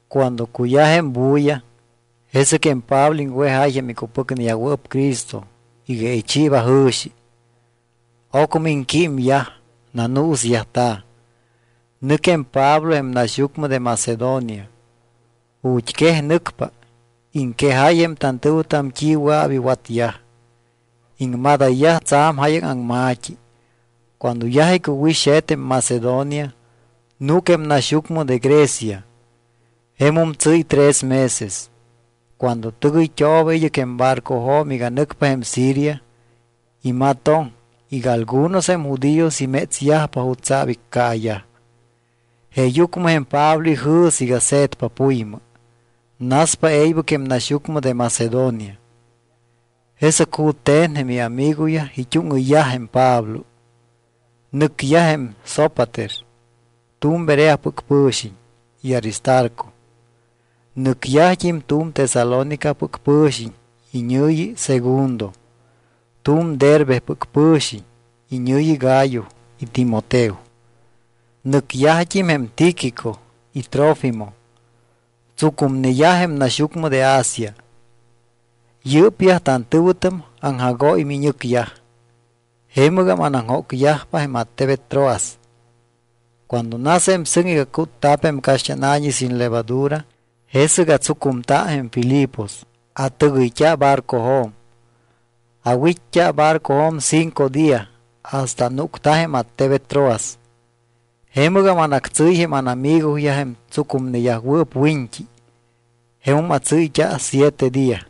Cuando cuyaj jém bulla, jesɨc jém Pablo iŋwejáy jém icupɨcneyajwɨɨp Cristo iga ichiiba jɨ̱xi. Ocmɨ iŋquímyaj, nanuusyajta̱. Nɨc jém Pablo jém naxyucmɨ de Macedonia. Ju̱t́ quej nɨcpa, iŋquejáy jém tantɨ̱wɨtam t́i wɨa̱p iwatyaj. Iŋmadayyaj tsa̱m jáyaŋ aŋma̱t́i. Cuando yaj icuwit́xe̱t jém Macedonia, núc jém naxyucmɨ de Grecia. Jemum tsɨ́y tres meses. Cuando tɨgɨyt́ooba id́ɨc jém barcojo̱m iga nɨcpa jém Siria, imatoŋ iga algunos jém judíos imétsyajpa jutsa̱p iccaayaj. Jeeyucmɨ jém Pablo ijɨ̱s iga se̱tpa puymɨ. Naspa e̱ybɨc jém naxyucmɨ de Macedonia. Jesɨc jute̱n jém iamigoyaj it́úŋɨyyaj jém Pablo. Nɨcyaj jém Sópater, tu̱m Bereapɨc pɨ̱xiñ, y Aristarco. Nɨcyajt́im tu̱m Tesalónicapɨc pɨ̱xiñ iñɨ̱yi Segundo, tu̱m Derbepɨc pɨ̱xiñ iñɨ̱yi Gayo y Timoteo. Nɨcyajt́im jém Tíquico y Trófimo, tsucumneyaj jém naxyucmɨ de Asia. Yɨ́pyaj tantɨ̱wɨtam aŋjagóy miñɨcyaj, jemɨgam anaŋjócyajpa jém attebet Troas. Cuando nas jém sɨŋ iga cútta̱p jém caxt́ána̱ñi sin levadura, jesɨc atsucumta jém Filipos, atɨgɨyt́a barcojo̱m. Awit́t́a barcojo̱m cinco día hasta anúcta jém attebet Troas. Jemɨgam anactsɨ́y jém ánamigoyaj jém tsucumneyajwɨɨp wiñt́i. Jemum atsɨ́yt́a siete día.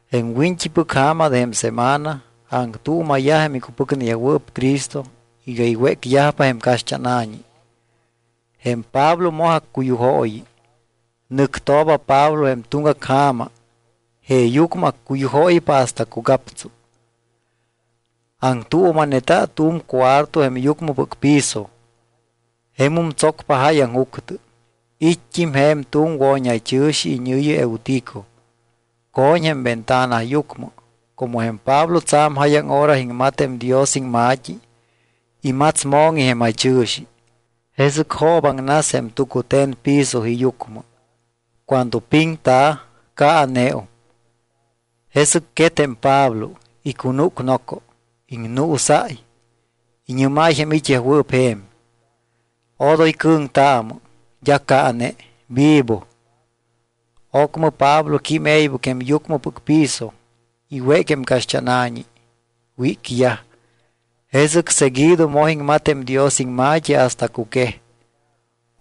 Jém wiñt́ipɨc ja̱ma de jém semana, aŋtuuma̱yaj jém icupɨcneyajwɨɨp Cristo iga iwécyajpa jém caxt́ána̱ñi. Jém Pablo moj accuyujooyi. Nɨctooba Pablo jém tuŋgac ja̱ma jeeyucmɨ accuyujóypa hasta cugaptsu. Aŋtuuma̱neta tu̱m cuarto jém yucmɨpɨc piso. Jemum tsocpa jáyaŋ juctɨ. It́t́im je̱m tu̱m wo̱ñjaychɨ̱xi iñɨ̱yi Eutico. Co̱ñ jém ventana yucmɨ. Como jém Pablo tsa̱m jáyaŋ hora iŋmat jém Dios iŋma̱t́i, imats mo̱ŋi jém jaychɨ̱xi, jesɨc joobaŋnas jém tucute̱n piso iyucmɨ. Cuando piŋta̱, caaneum. Jesɨc quet jém Pablo, icunúc noco, iŋnuusáy. Iñɨ́máy jém it́yajwɨɨp je̱m: —Odoy cɨ̱ŋtaamɨ. D́a caane, vivo. Ocmɨ Pablo quím e̱ybɨc jém yucmɨpɨc piso. Iwéc jém caxt́ána̱ñi, wícyaj. Jesɨc seguido moj iŋmat jém Dios iŋma̱t́i hasta cuquej.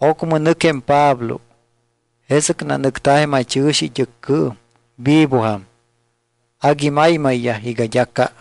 Ocmɨ nɨc jém Pablo. Jesɨc nanɨcta̱ jém jaychɨ̱xi it́ɨccɨɨm, vivojam. Agui maymayyaj iga d́a ca.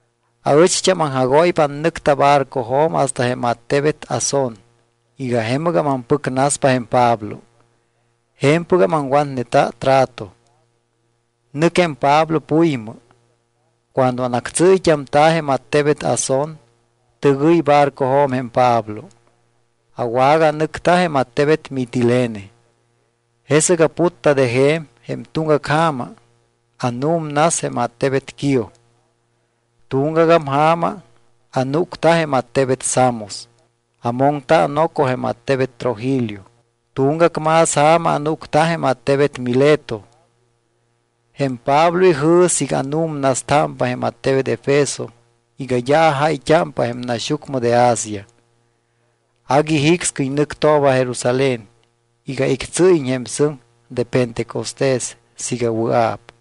Aɨcht́am aŋjagóypa anɨcta barcojo̱m hasta jém attebet Asón iga jemɨgam ampɨcnaspa jém Pablo. Je̱mpɨgam aŋwatneta trato. Nɨc jém Pablo puymɨ. Cuando anactsɨ́yt́amta̱ jém attebet Asón, tɨgɨy barcojo̱m jém Pablo, awaganɨcta jém attebet Mitilene. Jesɨc aputta de je̱m, jém tuŋgac ja̱ma anu̱mnas jém attebet Quío. Tuŋgagam ja̱ma anúcta jém attebet Samos. Amoŋta noco jém attebet Trogilio. Tuŋgac más ja̱ma anúcta jém attebet Mileto. Jém Pablo ijɨ̱s iga anu̱mnastámpa jém attebet Efeso iga d́a ajáyt́ámpa jém naxyucmɨ de Asia. Agui jicscɨy nɨctooba Jerusalén iga ictsɨ́yiñ jém sɨŋ de pentecostés siiga wɨa̱p.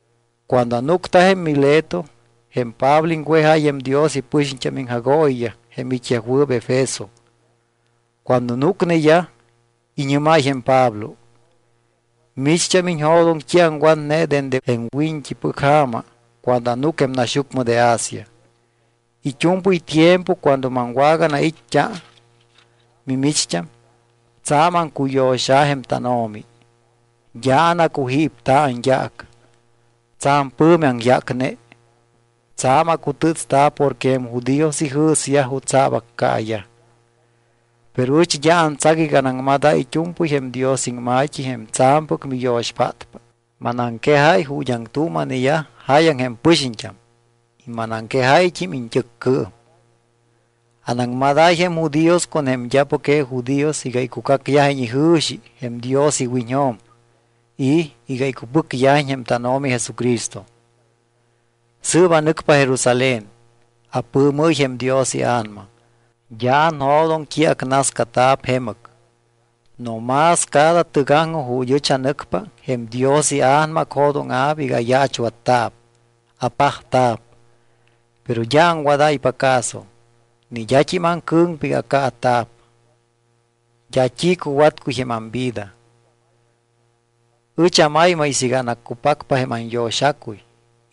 Cuando anúcta jém Mileto, jém Pablo iŋwejáy jém Dios ipɨxiñt́am iŋjagooyiyaj jém it́yajwɨɨp Efeso. Cuando núcneyaj, iñɨ́máy jém Pablo: —Micht́am iñjo̱doŋ t́i aŋwatne dende jém wiñt́ipɨc ja̱ma cuando anúc jém naxyucmɨ de Asia. It́u̱mpɨy tiempo cuando maŋwaganait́t́a mimicht́am, tsa̱m aŋcuyo̱xa̱ jém tánO̱mi. D́a anacujípta̱ anyaac. Tsa̱m pɨ̱mi aŋyácne. Tsa̱m acutɨ́tsta̱ porque jém judíos ijɨ̱syaj jutsa̱p accaayaj. Pero ɨch d́a antsac iga manaŋmadáy it́u̱mpɨy jém Dios iŋma̱t́i jém tsa̱mpɨc miyo̱xpátpa. Manaŋquejáy ju̱t́ aŋtuuma̱neyaj jáyaŋ jém pɨxiñt́am y manaŋquejáyt́im iñt́ɨccɨɨm. ’Anaŋmadáy jém judíos con jém d́apɨc je judíos iga icucacyajiñ ijɨ̱xi jém Dios iwiñjo̱m y iga icupɨcyajiñ jém tánO̱mi Jesucristo. Sɨɨp anɨcpa Jerusalén. Apɨɨmɨ́y jém Dios iA̱nama. D́a anjo̱doŋ t́i acnascata̱p jemɨc. No más cada tɨgaŋjoj ju̱t́ ɨch anɨcpa, jém Dios iA̱nama acjo̱dóŋa̱p iga ayaachwatta̱p, apajta̱p. Pero d́a aŋwadáypa caso. Ni d́at́im aŋcɨ̱ŋpa iga accaata̱p. D́a t́i cuwatcuy jém amvida. Ɨch amaymay siiga anaccupacpa jém anyo̱xacuy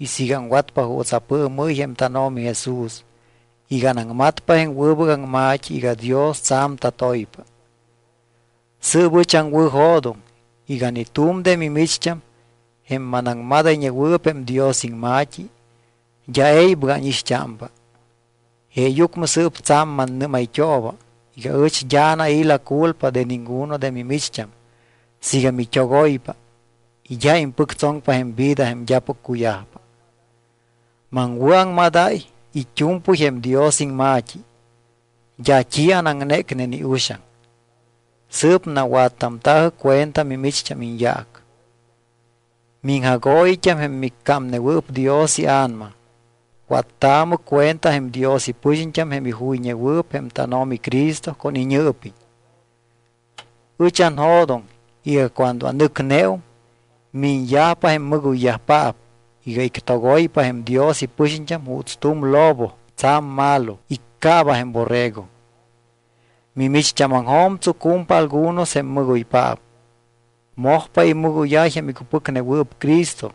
y siiga aŋwatpa juuts apɨɨmɨ́y jém tánO̱mi Jesús iga anaŋmatpa jém wɨbɨc aŋma̱t́i iga Dios tsa̱m tatoypa. ’Sɨɨp ɨch aŋwɨ̱jo̱doŋ iga ni tu̱m de mimicht́am, jém manaŋmadayñewɨɨp jém Dios iŋma̱t́i, d́a e̱ybɨc ánixt́ámpa. Jeeyucmɨ sɨɨp tsa̱m mannɨ́mayt́ooba iga ɨch d́a anai̱ la culpa de ninguno de mimicht́am siiga mit́ogoypa y d́a impɨctsoŋpa jém vida jém d́apɨc cuyajpa. Maŋwɨ̱aŋmadáy it́u̱mpɨy jém Dios iŋma̱t́i. D́a t́i anaŋnécne ni uxaŋ. Sɨɨp nawattamta̱jɨ cuenta mimicht́am iñyaac. Miŋjagooyit́am jém miccámnewɨɨp Dios iA̱nama, wattaamɨ cuenta jém Dios ipɨxiñt́am jém ijuyñewɨɨp jém tánO̱mi Cristo con iñɨɨpiñ. Ɨch anjo̱doŋ iga cuando anɨcneum, miñyajpa jém mɨgoyyajpaap iga ictogoypa jém Dios ipɨxiñt́am juuts tu̱m lobo tsa̱m malo iccaaba jém borrego. Mimicht́ámaŋjo̱m tsucumpa algunos jém mɨgoypaap. Mojpa imɨgóyáy jém icupɨcnewɨɨp Cristo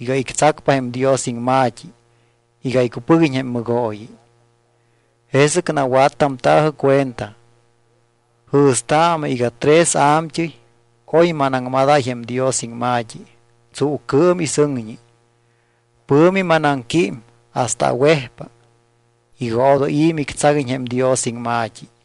iga ictsacpa jém Dios iŋma̱t́i iga iccupɨguiñ jém mɨgooyi. Jesɨc nawattamta̱jɨ cuenta. Jɨ̱staamɨ iga tres a̱mt́ɨy oy manaŋmadáy jém Dios iŋma̱t́i tsuucɨɨm y sɨŋñi. Pɨ̱mi manaŋquím hasta awejpa iga odoy i̱ mictsaguiñ jém Dios iŋma̱t́i.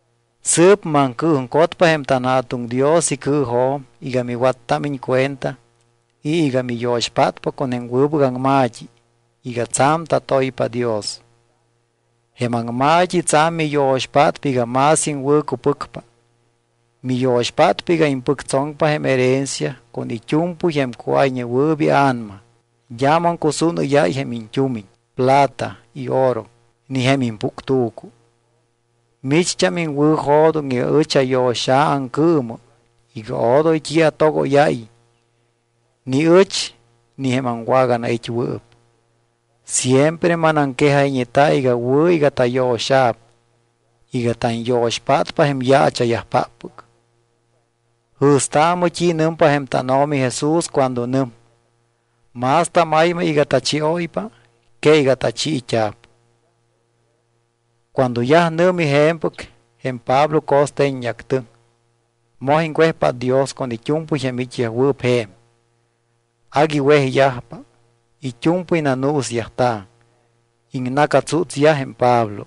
’Sɨɨp maŋcɨɨjuŋcotpa jém tanJa̱tuŋ Dios icɨɨjo̱m iga miwattámiñ cuenta y iga miyo̱xpátpa con jém wɨbɨc aŋma̱t́i iga tsa̱m tatoypa Dios. Jém aŋma̱t́i tsa̱m miyo̱xpátpa iga más iŋwɨ̱cupɨcpa. Miyo̱xpátpa iga impɨctsoŋpa jém herencia con it́u̱mpɨy jém cuáyñewɨɨp ia̱nama. D́a maŋcusúnɨ́yáy jém iñt́umiñ, plata y oro, ni jém impuctu̱cu. Micht́am iŋwɨ̱jo̱doŋ iga ɨch ayo̱xa̱ aŋcɨɨmɨ iga odoy t́i atogóyáyiñ ni ɨch ni jém aŋwaganait́wɨɨp. Siempre manaŋquejayñeta iga wɨ̱ iga tayo̱xa̱p iga tanyo̱xpátpa jém yaacha̱yajpáppɨc. Jɨ̱staamɨ t́i nɨmpa jém tánO̱mi Jesús cuando nɨm: “Más tamaymay iga tachióypa que iga tachiit́a̱p.” Cuando yaj nɨ̱mi je̱mpɨc, jém Pablo co̱ste̱ññeactɨŋ, moj iŋwejpát Dios con it́u̱mpɨy jém it́yajwɨɨp je̱m. Agui wejyajpa, it́u̱mpɨy nanuusyajta̱, iŋna̱catsútsyaj jém Pablo.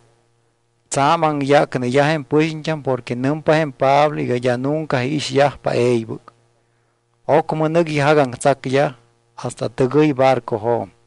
Tsa̱m aŋyácneyaj jém pɨxiñt́am porque nɨmpa jém Pablo iga d́a nunca iixyajpa e̱ybɨc. Ocmɨ nɨc ijagaŋtsacyaj hasta tɨgɨy barcojo̱m.